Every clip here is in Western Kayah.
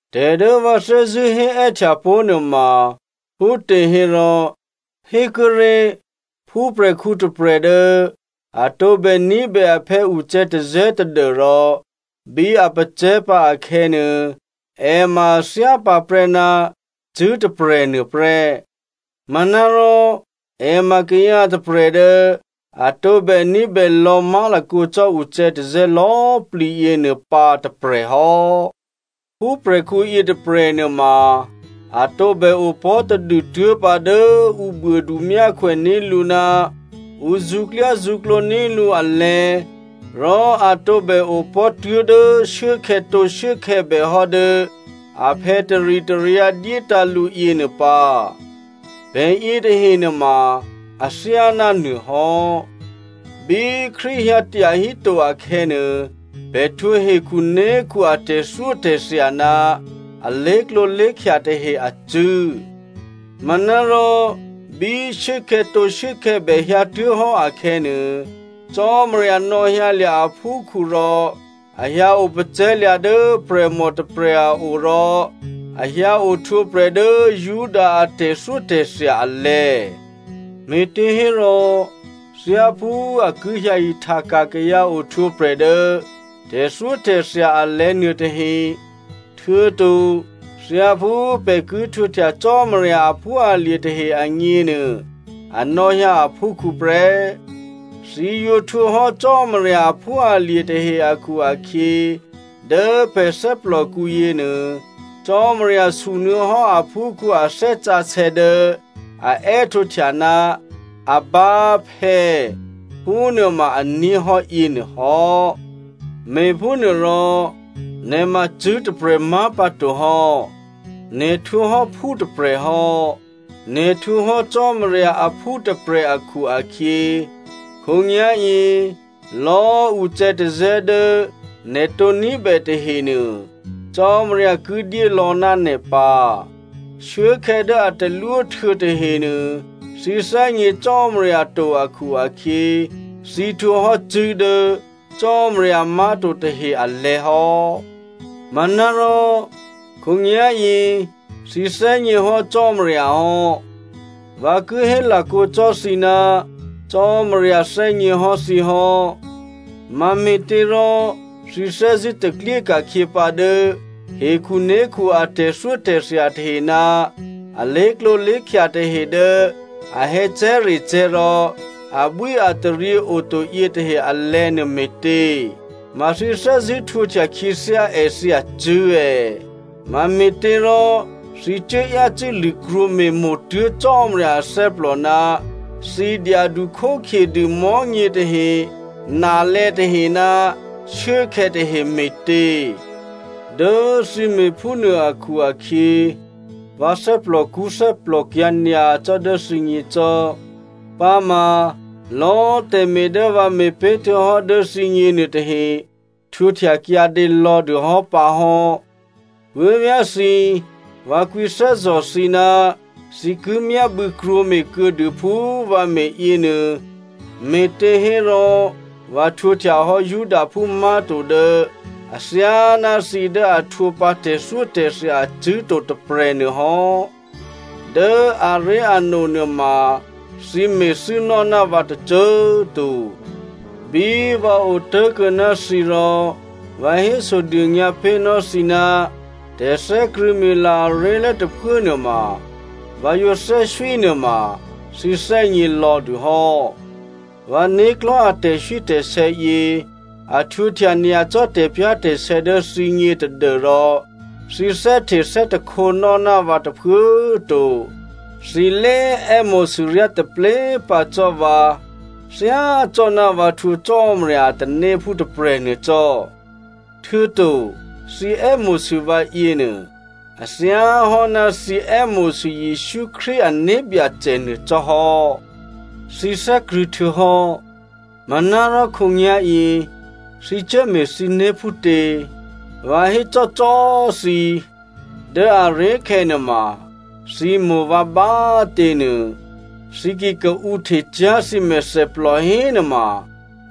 Tè̤ dố vǎ thè́zṳ̂́ hé è́htya pó̤ nuôma phútěhérò, hékuốré̤, phúprè̤khǔ tôprè̤ dố a tǒbè ní̤bè aphè̌ ucè̌tazè̌ tadû́rò bí a pacè̤̌pǎ akhè̌nuô, è ma a thyá pǎprè́ ná cṳ̂́ tôprè̤nuô prè́. Manárò è ma kayǎ tôprè̤ dố a tǒbè ní̤bè lò̌ má̤lakǒ cò́ ucè̌tazè̌ lò̌꤮ plǐ yěnuô pǎ tôprè̤ hò́. Phúprè̤khǔ yětôprè̤ nuôma a tǒbè opò̤́ tadû tuố̤pǎ dố ǔ buôdu myákhwè ní̤ lǔ ná ǔ zṳ̌klyázṳ̌klǒ ní̤ lǔ alè̤̌, rò a tǒbè opò̤́ tuố̤dố shuốkhè̌tǒ shuốkhè̌bè hò́ dố aphè̌ taritaryǎ dyétǎ̤ lǔ yěnuô pǎ. Pè̤ yětahe nuôma athyáná nuôhò́. Bí Krístu hyǎ tyahíto akhè̌nuô, pè̤ htwǒ hekhuné̤khu a tè̤thyótè̤thya ná a lé̤klǒlé̤khya tahe acṳ̂́. Manárò bí shuốkhè̌tǒ shuốkhè̌bè hyǎtuố̤hò́ akhè̌nuô, Cò́marya nò̌hyǎlya̤ aphúkhǔ rò a hyǎ opacè̤̌lya̤ dố prè̤mò tôprè̤ a o, rò a hyǎ ohtwǒprè̤ dố Juda a tè̤thyótè̤thya alè̤̌. Me̤těhérò, thyáphú a ki hyǎ ihtaka̤ kayǎ ohtwǒprè̤ dố tè̤thyótè̤thya alè̤̌ nuôtahe, htuô̌to thyáphú pè̤ ki htwǒhtya Cò́marya aphúalye̤ tahe agněnuô a nò̌hyǎ aphúkhǔ prè́. Thǐ yǒ htwǒhò́ Cò́marya aphúalye̤ tahe akhu-akhyě, dố pè̤ thè́plòkǔ yěnuô, Cò́marya sunuô̌hò́ aphúkhǔ a Thè́ Sǎsè̌ dố a è́htǒhtya, “Abba, phè̌” phúnuô ma a ní̤ hò́ yěnuôhò́. Me̤phúnuôrò nè̤ ma cṳ̂́ tôprè̤ má̤pǎto hò́. Nè̤ htwǒ hò́ phú tôprè̤ hò́. Nè̤ htwǒ hò́ Cò́marya aphú tôprè̤ akhu-akhyě, khǒnyá̤yě lò̌꤮ ucè̌tazè̌ dố nè̤ tǒ ní̤bè tahenuô, Cò́marya ki dyélò̌ ná nè̤ pǎ. Shuốkhè̌ dố a talwó htuô̌ tahenuô, thǐ thè́gně Cò́marya to akhu-akhyě, thǐ htwǒhò́ cṳ̂́ dố cò́marya má̤to tahe alè̤̌ hò́. Manárò khǒnyá̤yě thǐ thè́gněhò́ Cò́marya hò́. Vǎ ki hé lakǒ cò́ thǐ ná Cò́marya thè́gněhò́ thǐ hò́. Mame̤těrò thǐ thè́zṳ̂́ taklyé ka̤khyě pǎ dố hekhuné̤khu a tè̤thyótè̤thya tahe ná alé̤klǒ lé̤khya tahe dố a hè̌cè̤́recè̤́ rò abwíataryě oto yětahe alè̤̌ nuô me̤tě? Ma thǐ thè́zṳ̂́ htwǒhtya khyěthyá èthǐ acṳ̂́ è̌? Mame̤těrò thǐ cuố yácû́ lṳ̂krwǒ me̤mo̤tuố̤ Cò́marya athè́plò ná thǐ dyadu khókhyedû mò̤́nyětahe, nalè̌ tahe ná shuốkhè̌ tahe me̤tě? Dố thǐ me̤phúnuô akhu-akhyě vǎ thè́plòkṳ́ thè́plòkyǎ̤ nyacò́ dố thǐgně cò́. Pǎma lò̌꤮ tè̤me̤ dố vǎ me̤ pé̤htuô̌hò́ dố thǐgně nuôtahe, htwǒhtya kyǎdě lò̌dû hò́ pǎ hò́. Puố̤vyá̤ thǐ꤮, vǎ kwǐthè́zò̤ thǐ ná thǐ ki myábû̌ krwǒme̤ kuô̌dû phú vǎ me̤ yěnuô, me̤těhérò vǎ htwǒhtyahò́ Judaphú má̤to dố athyáná thǐ dố a htwǒ pǎ tè̤thyótè̤thya acṳ̂́ to tôprè̤ nuôhò́. Dố aré̤ano nuôma thǐ me̤thû́nò́ ná vǎ tôcô꤮ to. Bí vǎ otố̤kuô̌ ná thǐ rò vǎ hésodônyǎ pé̤nò́ thǐ ná tè̤thè́krṳ̂̌mila aré̤lố tôphuốnuôma vǎ yǒ thè́swí nuôma thǐ thè́gně lò̌dû hò́. Vǎ né̤klò̤́ a tè̤swítè̤sè̌ yě a htwǒhtya nyacò́ tè̤pyá̤tè̤sè̌ dố thǐgně tadû́rò thǐ thè́hte thè́takhǒnò́ ná vǎ tôphuố꤮ to. Thǐ lé è́mo̤sû ryá taplé꤮ pǎ cò́ vǎ thyácò́ná vǎ htwǒ Cò́marya a tanéphú tôprè̤nuô cò́, htuô̌to thǐ è́mo̤sû vǎ yěnuô, a thyáhò́ ná thǐ è́mo̤sû Jesǔ Krístu ané̤byacè nuô cò́ hò́. Thǐ thè́krṳ̂̌ htuô̌hò́, manárò khǒnyá̤yě thǐ cuốme̤ thǐné̤ phútě? Vǎ hécò́cò́꤮ thǐ, dố aré̤khè̌ nuôma thǐ mo̤ vǎ bá꤮ těnuô thǐ ki kaǔhtecyá̤ thǐ mèthèplò hénuôma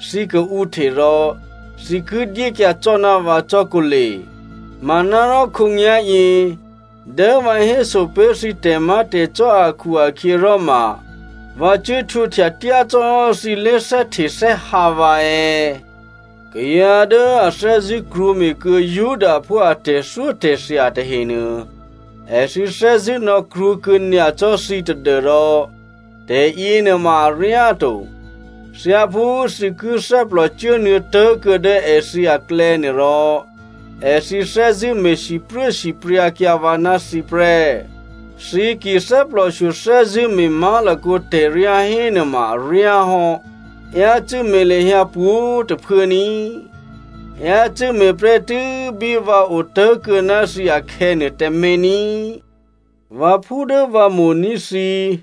thǐ kaǔhte rò thǐ ki dyékyǎ cò́ ná vǎ cò́ kǒle. Manárò khǒnyá̤yě dố vǎ héso pé̤ thǐ tè̤má̤tè̤cò́ akhu-akhyěròma vǎ cuố htwǒhtya tyácò́hò́ thǐ lé̤thè́htethè́hǎ vǎ è̌? Kayǎ dố a thè́zṳ̂́ krwǒme̤kuô̌ Judaphú a tè̤thyótè̤thya tahenuô èthǐ thè́zṳ̂́ nò̌krwǒkuô̌ nyacò́ thǐ tadû́rò tè̤yěnuôma aryáto. Thyáphú thǐ ki thè́plò cuốnuô̌tố̤ kuô̌ dố èthǐ aklè̌nuô rò, èthǐ thè́zṳ̂́ me̤ sipruốsipryǎkyǎ vǎ ná thǐ prè́. Thǐ ki thè́plòshyo thè́zṳ̂́ me̤ má̤lakǒ tè̤ryá hénuôma aryá hò́. Yácû́ me̤ lahyǎ pwǒ̤꤮ tôphuố ní꤮. Yácû́ me̤ prè́tû́ bí vǎ otố̤kuô̌ ná thǐ akhè̌nuô tǎmé̤ ní꤮. Vǎphú dố vǎ mo̤ní̤ thǐ꤮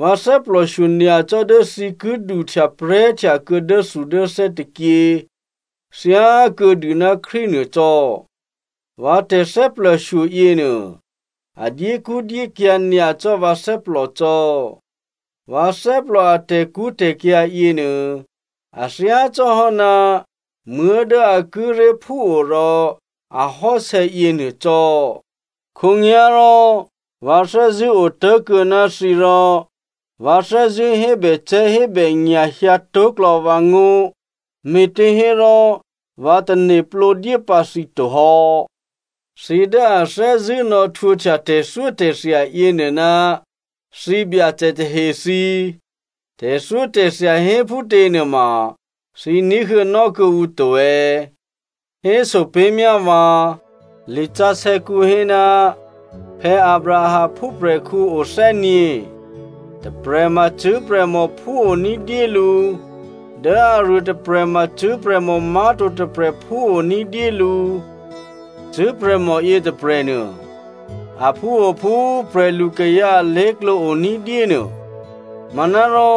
vǎ thè́plòshyo nyacò́ dố thǐ ki duhtyaprè̤́htya kuô̌ dốthudốthè́ tôkyě thyákuô̌dû ná Krístu nuô cò́. Vǎ tè̤thè́plòshyo yěnuô, a dyékṳ́dyékyǎ̤ nyacò́ vǎ thè́plò cò́. Vǎ thè́plò a tè̤kṳ́tè̤kyǎ̤ yěnuô, a thyácò́hò́ ná muố̤ dố a kíré̤ phúo rò ahò́sè̌ yěnuô cò́. Khǒnyá̤rò vǎ thè́zṳ̂́ otố̤kuô̌ ná thǐ rò vǎ thè́zṳ̂́ hébècè̤́hébènya̤ hyǎtó̤klò̌ vǎngó̤ me̤těhérò vǎ tane̤plǒ dyé pǎ thǐ to hò́. Thǐ dố a thè́zṳ̂́ nò̌htwǒhtya tè̤thyótè̤thya yěnuô ná thǐbyacè tahe thǐ꤮ tè̤thyótè̤thya hé phútěnuôma thǐ ní̤huô̌nò́ kuô̌ǔ to è̌? Héso pé̤myá vǎ. Lisǎsè̌kǔ hé, Abraham phúprè̤khǔ o thè́gně. Tôprè̤ ma cṳ̂́prè̤mò phúo ní̤dyé lǔ, dố aruôtôprè̤ ma cṳ̂́prè̤mò má̤to tôprè̤ phúo ní̤dyé lǔ. Cṳ̂́prè̤mò yětôprè̤nuô aphúo phú prè̤lukayǎ alé̤klǒ o ní̤dyé nuô. Manárò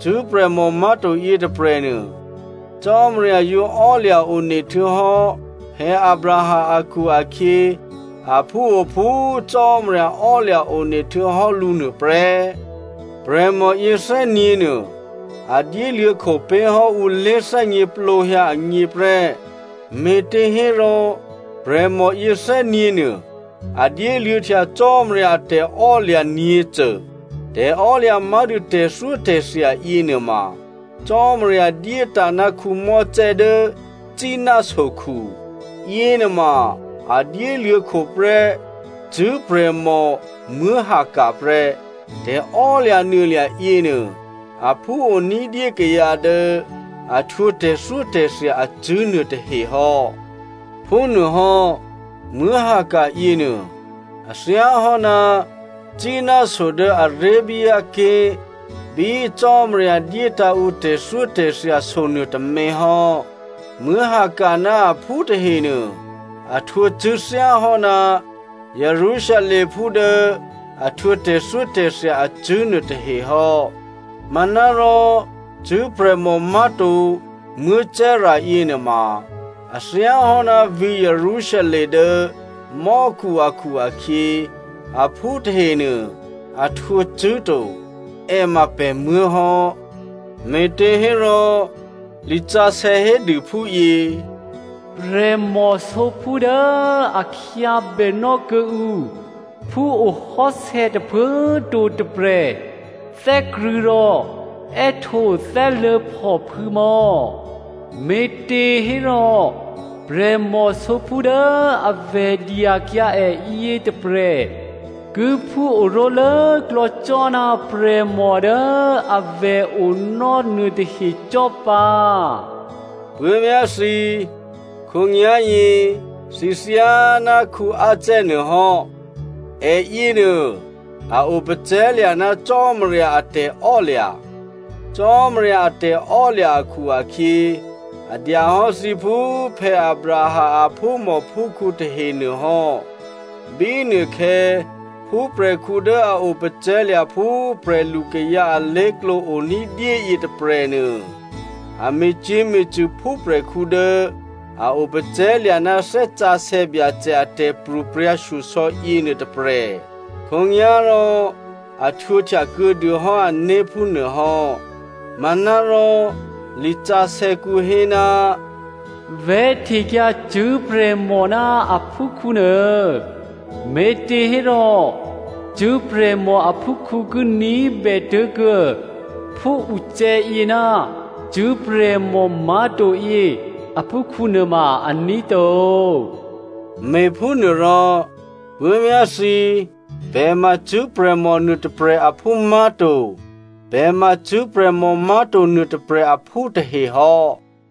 cṳ̂́ prè̤mò má̤to yětôprè̤nuô, Cò́marya yǒ ò́lya̤ one htuô̌hò́ Abraham akhu-akhyě, aphúo phú Cò́marya ò́lya̤ one htuô̌hò́ lǔ nuôprè́. Prè̤mò yěthè́nyě̤nuô a dyéluô̌ kho pé̤hò́ ǔ lé̤thè́gněplǒhyǎ agně prè́, me̤těhérò prè̤mò yě thè́nyě̤ nuô a dyéluô̌htya Cò́marya a tè̤ò́lya̤ nyě̤cô. Tè̤ò́lya̤ má̤dû tè̤thyótè̤thya yěnuôma Cò́marya dyétǎ̤ ná Mosè dố Sínai sokhu. Yěnuôma a dyéluô̌ kho prè́ cṳ̂́prè̤mò Hagar prè́. Tè̤emaklò̤ yěnuô, aphúo ní̤dyé kayǎ dố a htwǒ tè̤thyótè̤thya acṳ̂́ nuôtahe hò́. Phúnuôhò́, Hagar yěnuô a thyáhò́ ná Sínai so dố Arabia ké̤ bí꤮ Cò́marya dyétǎ̤ ǔ tè̤thyótè̤thya so nuôtômě hò́. Hagar ná aphú tahenuô a htwǒ cṳ̂́ thyáhò́ná Jerusalemphú dố a htwǒ tè̤thyótè̤thya acṳ̂́ nuôtahe hò́. Manárò cṳ̂́prè̤mò má̤to Sara yěnuôma a thyáhò́ ná vǐ̤ Jerusalem dố mò́khu akhu-akhyě, aphú tahenuô a htwǒ cṳ̂́ to. È ma pè̤muố̤ hò́. Me̤těhérò lisǎsè̌ hédû phúyě, “Prè̤mò sǒphú꤮ dố a khyábè nò́ kuô̌ǔ phúohò́sè̌ tôphuố꤮ to tôprè̤, thè́krṳ̂̌ rò è́htǒ thè́luố̤phòphû̌ mò̌꤮. Me̤těhérò prè̤mò sǒphú dố avè̤ dyakyǎ è yětôprè̤ ki phú oró̤ lốklò̌ cò́ ná prè̤mò dố avè̤ onò́ nuôtahe cò́ pǎ.” Puố̤vyá̤ thǐ꤮, khǒnyá̤yě thǐ thyáná Isaac nuô hò́. È yěnuô a opacè̤̌lya̤ ná Cò́marya a tè̤ò́lya̤. Cò́marya a tè̤ò́lya̤ akhu-akhyě, a dya hò́ thǐ phú Abraham aphúmòphúkhǔ tahenuô hò́. Bínuôkhè̌ phúprè̤khǔ dố a opacè̤̌lya̤ phú prè̤lukayǎ alé̤klǒ o ní̤dyé yětôprè̤nuô, a me̤cyě̤me̤cṳ̂ phúprè̤khǔ dố a opacè̤̌lya̤ ná Thè́ Sǎsè̌ Byacè a tè̤pro̤prya̤ shyosò̌ yěnuô tôprè̤. Khǒnyá̤rò, a htwǒhtya kuô̌ dûhò́ ané̤ phúnuô hò́. Manárò lisǎsè̌kǔ hé, “Vè̤́htekyǎ cṳ̂́prè̤mò ná a phúkhǔ nuô, me̤těhérò cṳ̂́prè̤mò aphúkhǔ ki ní̤bè tố̤kuô̌ phúucè̌yě ná cṳ̂́prè̤mò má̤to yě aphúkhǔ nuôma aní̤ to.” Me̤phúnuôrò puố̤vyá̤ thǐ꤮, pè̤ ma cṳ̂́prè̤mò nuô tôprè̤ aphú má̤to. Pè̤ ma cṳ̂́prè̤mò má̤to nuô tôprè̤ aphú tahe hò́.